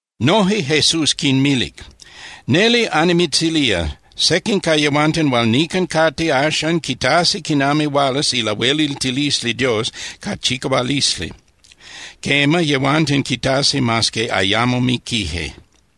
Noje Jesús quinmilic: —Neli annimitzilía, sequin ca yehuanten hual nican cate axan quitasi quinami hualas ilahueliltilisli Dios ca chicahualisli. Quema, yehuanten quitasi mas que ayamo miquije.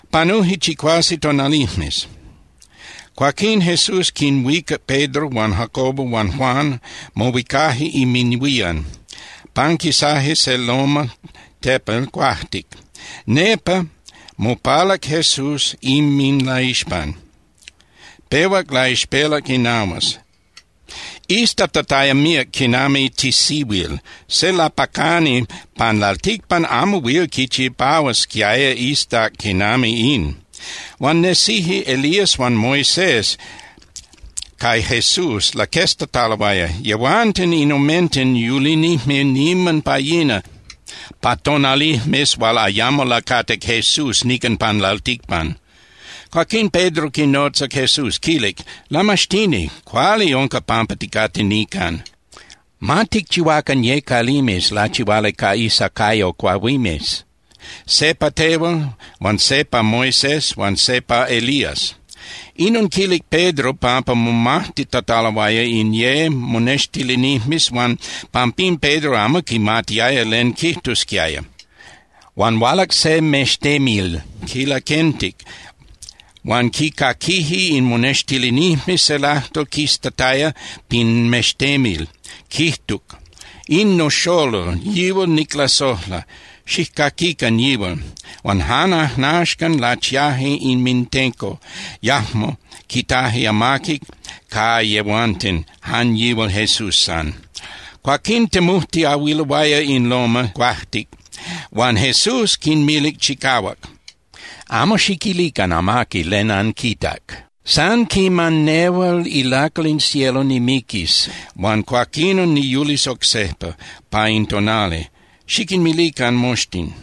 Panuje chicuase tonalijmes. Cuaquín Jesús quinhuicac Pedro huan Jacobo huan Juan, mohuicaje inminhuían, panquisaje se loma (tepel) cuajtic. Nepa mopalac Jesús inminlaixpan. Pehuac laixpelac inahuas, iztatataya míac quinami tisihuil. Se lapacani pan lalticpan amo huil quichipahuasquiaya iztac quinami in. Huan nesije Elías huan Moisés, ca Jesús laqueztataloaya. Yehuanten in omenten yulinijme niman pa yina pa tonalijmes hual ayamo lacatic Jesús nican pan lalticpan. Cuaquín Pedro quinotzac Jesús, quilic: —¡Lamaxtini! Cuali unca pampa ticate nican. Ma ticchihuacan ye calimes lachihuali ca isacayo cuahuimes, se pa tehual huan se pa Moisés huan se pa Elías. Inon quilic Pedro pampa momajtitataloaya in ye monextilinijmes huan pampín Pedro amo quimatiaya len quijtusquiaya. Huan hualac se mextemil, quinlaquentic huan quicaquije in monextilinijmes se lajtol quistataya pin mextemil, quijtuc: —In noxolol, yihual niclasojla. Xijcaquican yihual. Huan jan ajnaxcan, lachiaje inmintenco, yajmo quitaje amaqui ca yehuanten, jan yihual Jesús san. Cuaquín temujtiahuiloaya in loma (tepel) cuajtic, huan Jesús quinmilic chicahuac: —Amo xiquilican amaqui len anquitac. San quiman nehual ilacal in cielo nimiquis huan cuaquinon niyulis oc sejpa, pa in tonali, xiquinmilican moxtin.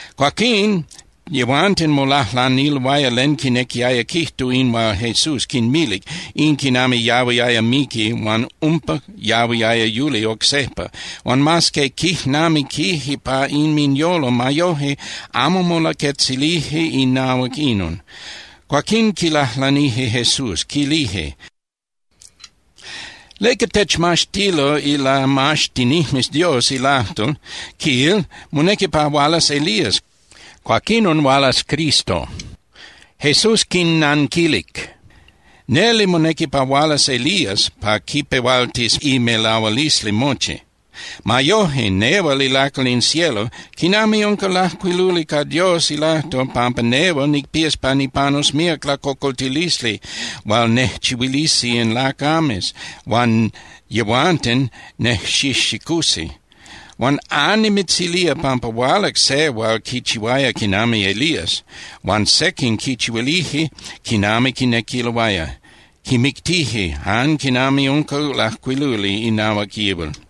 Cuaquín yehuanten molajlaniloaya len quinequiaya quijtu in hual Jesús quinmilic, in quinami yahuiaya miqui huan umpa yahuiaya yuli oc sejpa. Huan mas que quijnamiquije pa inminyolo, ma yoje amo molaquetzilije inahuac inon. Cuaquín quilajlanije Jesús, quilije: —¿Leca techmaxtilo ilamaxtinijmes Dios ilajtol, quil, monequi pa hualas Elías, cuaquinon hualas Cristo? Jesús quinnanquilije: —Neli monequi pa hualas Elías pa quipehualtis imelahualisli mochi. Ma yoje, nehual ilacal in cielo, ¿quinami unca lajcuiluli ca Dios ilajtol pampa nehual nicpías pa nipanus míac lacocoltilisli hual nejchihuilisi in lacames, huan yehuanten nejxijxicusi? Huan annimitzilía pampa hualac se hual quichihuaya quinami Elías, huan sequin quichihuilije quinami quinequiloaya. Quimictije jan quinami unca lajcuiluli inahuac yihual.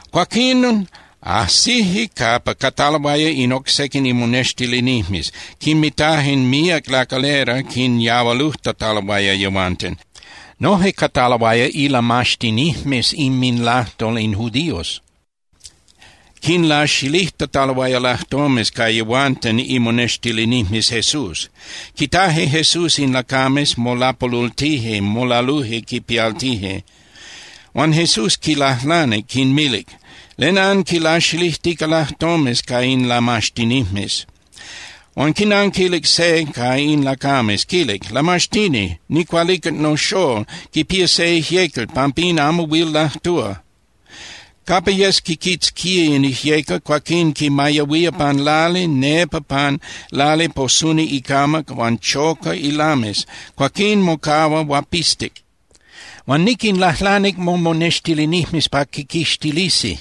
Cuaquín ajsije capa cataloaya in oc sequin imonextilinijmes. Quinmitaje míac lacalera quinyahualujtataloaya yehuanten. Noje cataloaya ilamaxtinijmes inminlajtol in judíos. Quinlaxilijtataloaya lajtomes ca yehuanten imonextilinijmes Jesús. Quitaje Jesús in lacames, molapolultije, molaluje quipialtije. Huan Jesús quinlajlanic, quinmilic: —¿Len anquilaxilijtica lajtomes ca in lamaxtinijmes? Huan quinanquilic se ca in lacames, quilic: —¡Lamaxtini! Nicualicac noxól, quipía se ijyecal, pampín amo huil lajtúa. Capa yes quiquitzquía in ijyecal, cuaquín quimayahuía pan lali, nepa pan lali posuni icamac huan choca ilames. Cuaquín mocahua huapistic. Huan niquinlajlanic momonextilinijmes pa quiquixtilisi,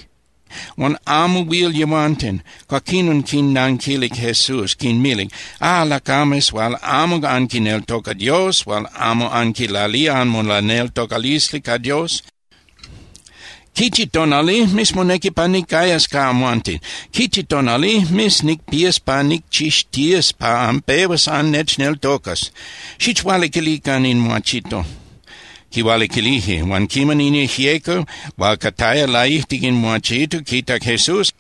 huan amo huil yehuanten. Cuaquinon quinnanquilic Jesús, quinmilic: —¡Ah, lacames hual amo anquineltoca Dios, hual amo anquilalía anmolaneltocalisli ca Dios! ¿Quichi tonalijmes monequi pa nicayas ca amhuanten? ¿Quichi tonalijmes nicpías pa nicchixtías pa anpehuas annechneltocas? ¡Xichhualiquilican in muachito! Quihualiquilije. Huan quiman in ijyecal hual cataya laijtic in muachito quitac Jesús,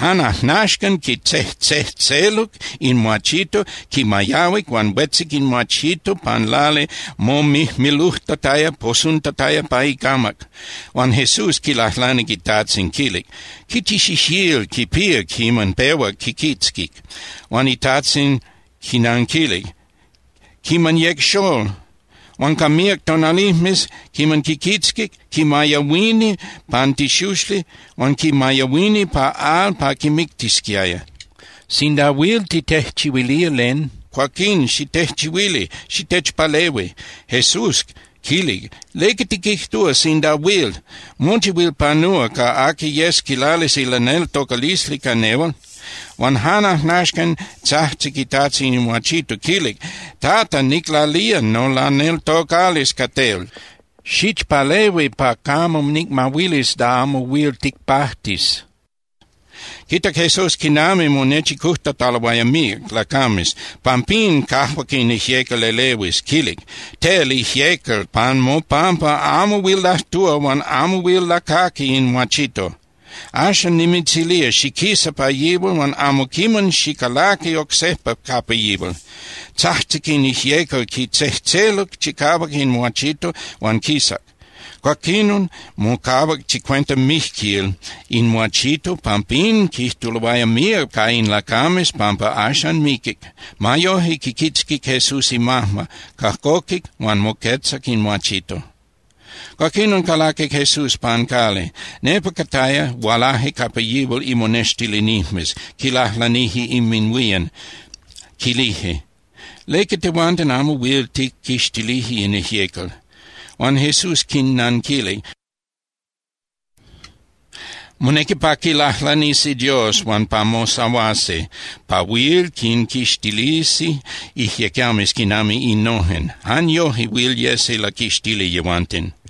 jan ajnaxcan quitzejtzejtzeluc in muachito, quimayahuic huan huetzic in muachito pan lali momijmilujtataya, posuntataya pa icamac. Huan Jesús quilajlanic itajtzin, quilic: —¿Quichi xixíl quipía quiman pehuac quiquitzquic? Huan itajtzin quinanquilic: —Quiman yec xól. Huan ca míac tonalijmes quiman quiquitzquic, quimayahuini pan tixuxli huan quimayahuini pa al pa quimictisquiaya. Sinda huil titejchihuilía len, cuaquín xitejchihuili, xitechpalehui. Jesús quilic: —¿Leca tiquijtúa “Sinda huil”? Mochi huil panúa ca aqui yes quilalis ilaneltocalisli ca nehual. Huan jan ajnaxcan tzajtzic itajtzin in muachito, quilic: —¡Tata, niclalía nolaneltocalisli ca tel! ¡Xichpalehui pa camo nicmahuilis da amo huil ticpajtis! Quitac Jesús quinami monechicujtataloaya míac lacames. Pampín cajuac in ijyecal elehuis, quilic: —¡Tel, ijyecal, pan mopampa amo huil lajtúa huan amo huil lacaqui in muachito! ¡Axan nimitzilía xiquisa pa yihual huan amo quiman xicalaqui oc sejpa capa yihual! Tzajtzic in ijyecal, quitzejtzeluc chicahuac in muachito huan quisac. Cuaquinon mocahuac chicuenta mijquil in muachito. Pampín quijtuloaya míac ca in lacames pampa axan miquic. Ma yoje, quiquitzquic Jesús imajma, cajcoquic huan moquetzac in muachito. Cuaquinon calaquic Jesús pan cali. Nepa cataya, hualaje capa yihual imonextilinijmes quilajlanije inminhuían, quilije: —¿Leca tehuanten amo huil tijquixtilije in ijyecal? Huan Jesús quinnanquilic: —Monequi pa quilajlanisi Dios huan pa mosahuasi pa huil quinquixtilisi ijyecames quinami innojen. Jan yoje huil yesi laquixtili yehuanten.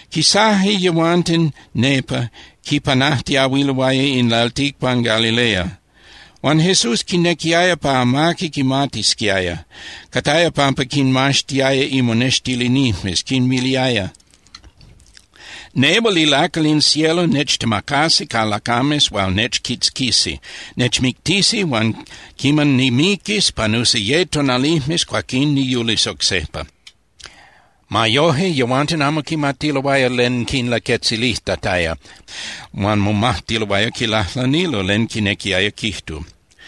Quisaje yehuanten nepa, quipanajtiahuiloaya in lalticpan Galilea, huan Jesús quinequiaya pa amaqui quimatisquiaya. Cataya pampa quinmaxtiaya imonextilinijmes, quinmiliaya: —Nehual ilacal in cielo nechtemacasi ca lacames hual nechquitzquisi. Nechmictisi huan quiman nimiquis, panusi ye tonalijmes, cuaquín niyulis oc sejpa. Ma yoje, yehuanten amo quimatiloaya len quinlaquetzilijtataya huan momajtiloaya quilajlanilo len quinequiaya quijtu.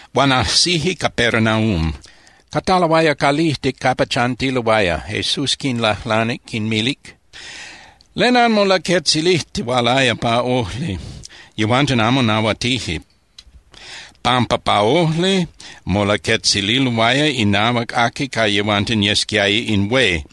Huan ajsije Capernaum. Cataloaya calijtic capa chantiloaya, Jesús quinlajlanic, quinmilic: —¿Len anmolaquetzilijtihualaya pa ojli? Yehuanten amo nahuatije, pampa pa ojli molaquetzililoaya inahuac aqui ca yehuanten yesquiaya in hué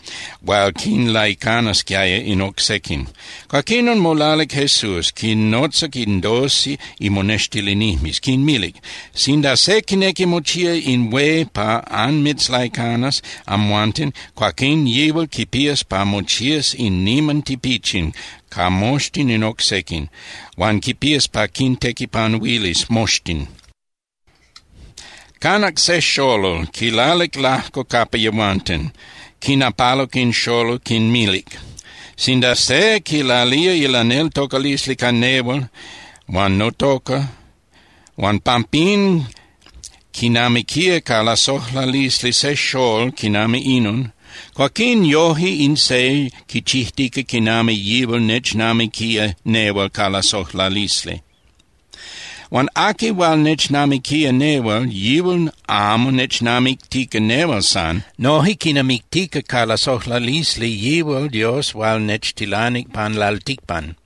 hual quinlaicanasquiaya in oc sequin. Cuaquinon molalic Jesús, quinnotzac in doce imonextilinijmes, quinmilic: —Sinda se quinequi mochía in hué pa anmitzlaicanas amhuanten, cuaquín yihual quipías pa mochías in niman tipichin ca moxtin in oc sequin, huan quipías pa quintequipanuilis moxtin. Canac se xolol, quilalic lajco capa yehuanten, quinapaluc in xolol, quinmilic: —Sinda se quilalía ilaneltocalisli ca nehual huan notoca, huan pampín quinamiquía ca lasojlalisli se xól quinami inon, cuaquín yoje in se quichijtica quinami yihual nechnamiquía nehual ca lasojlalisli. Huan aqui hual nechnamiquía nehual, yihual amo nechnamictica nehual san. Noje quinamictica ca lasojlalisli yihual Dios hual nechtilanic pan lalticpan.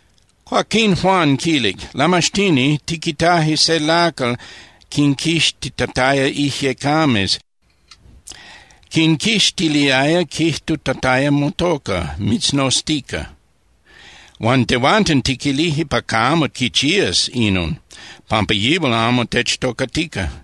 Cuaquín Juan quilic: —Lamaxtini, tiquitaje se lacal quinquixtitataya ijyecames, quinquixtiliaya quijtutataya motoca, mitznoztica. Huan tehuanten tiquilije pa camo quichías inon, pampa yihual amo techtocatica.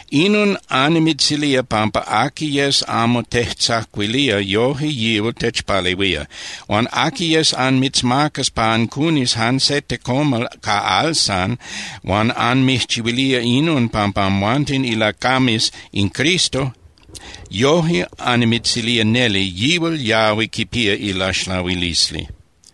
Inon annimitzilía pampa aqui yes amo tejtzacuilía, yoje yihual techpalehuía. Huan aqui yes anmitzmacas pa ancunis jan se tecomal ca al san, huan anmijchihuilía inon pampa amhuanten ilacames in Cristo, yoje annimitzilía neli, yihual yahui quipía ilaxlahuilisli.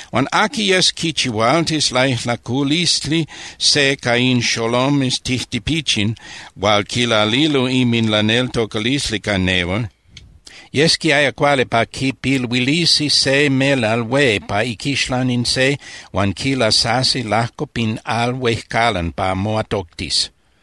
’Huan aqui yes quichihualtis laijlaculisli se ca in xolomes tijtipichin hual quilalilo inminlaneltocalisli ca nehual, yesquiaya cuali pa quipiluilisi se melal hué pa iquixlan in se huan quilasasi lajco pa al huejcalan pa moatoctis.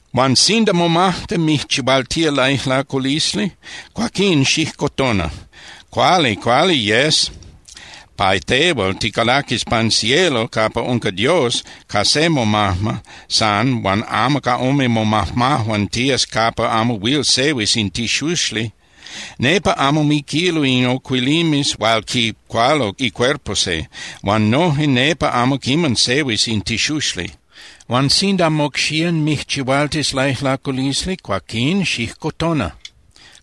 Huan sinda momajma mijchihualtía laijlaculisli, cuaquín xijcotona. Cuali, cuali yes pa tehual ticalaquis pan cielo capa unca Dios ca se momajma san huan amo ca ome momajmajuan tías capa amo huil sehuis in tixuxli. Nepa amo miquilo in ocuilimes hual quicualo icuerpo se, huan noje nepa amo quiman sehuis in tixuxli. Huan sinda mocxían mijchihualtis laijlaculisli, cuaquín xijcotona.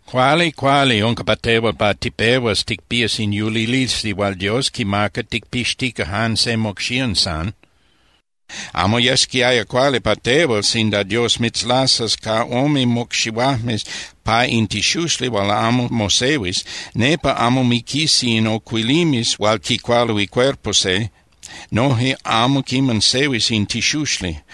Cuali, cuali unca pa tehual pa tipehuas ticpías in yulilisli hual Dios quimaca ticpixtica jan se mocxían san. Amo yesquiaya cuali pa tehual sinda Dios mitzlasas ca ome mocxihuajmes pa in tixuxli hual amo mosehuis. Nepa amo miquisi in ocuilimes hual quicualo icuerpo se, noje amo quiman sehuis in tixuxli.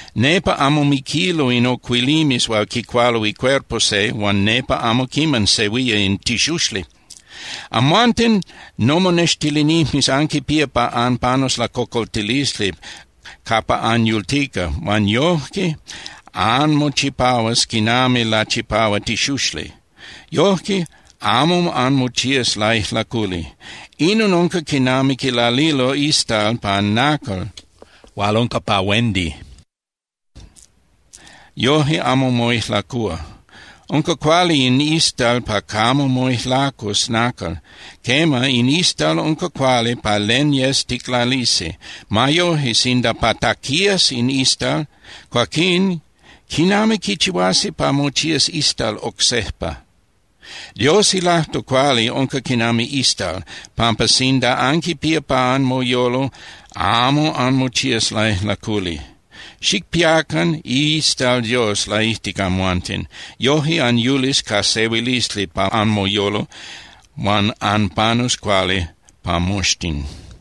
Nepa amo miquilo in ocuilimes hual quicualo icuerpo se huan nepa amo quiman sehuía in tixuxli. ’Amhuanten nomonextilinijmes anquipía pa anpanus lacocoltilisli capa anyultica, huan yojque anmochipahuas quinami lachipahua tixuxli. Yojque amo anmochías laijlaculi. Inon unca quinami quilalilo istal pan nacal hual unca pa huendi. Yoje amo moijlacúa. Unca cuali in istal pa camo moijlacus nacal. Quema, in istal unca cuali pa len yes ticlalisi. Ma yoje, sinda pataquías in istal, cuaquín ¿quinami quichihuasi pa mochías istal oc sejpa? Dios ilajtol cuali unca quinami istal, pampa sinda anquipía pa anmoyolo, amo anmochías laijlaculi. Xicpiacan iistal Dios laijtic amhuanten. Yoje anyulis ca sehuilisli pa anmoyolo huan anpanus cuali ca moxtin.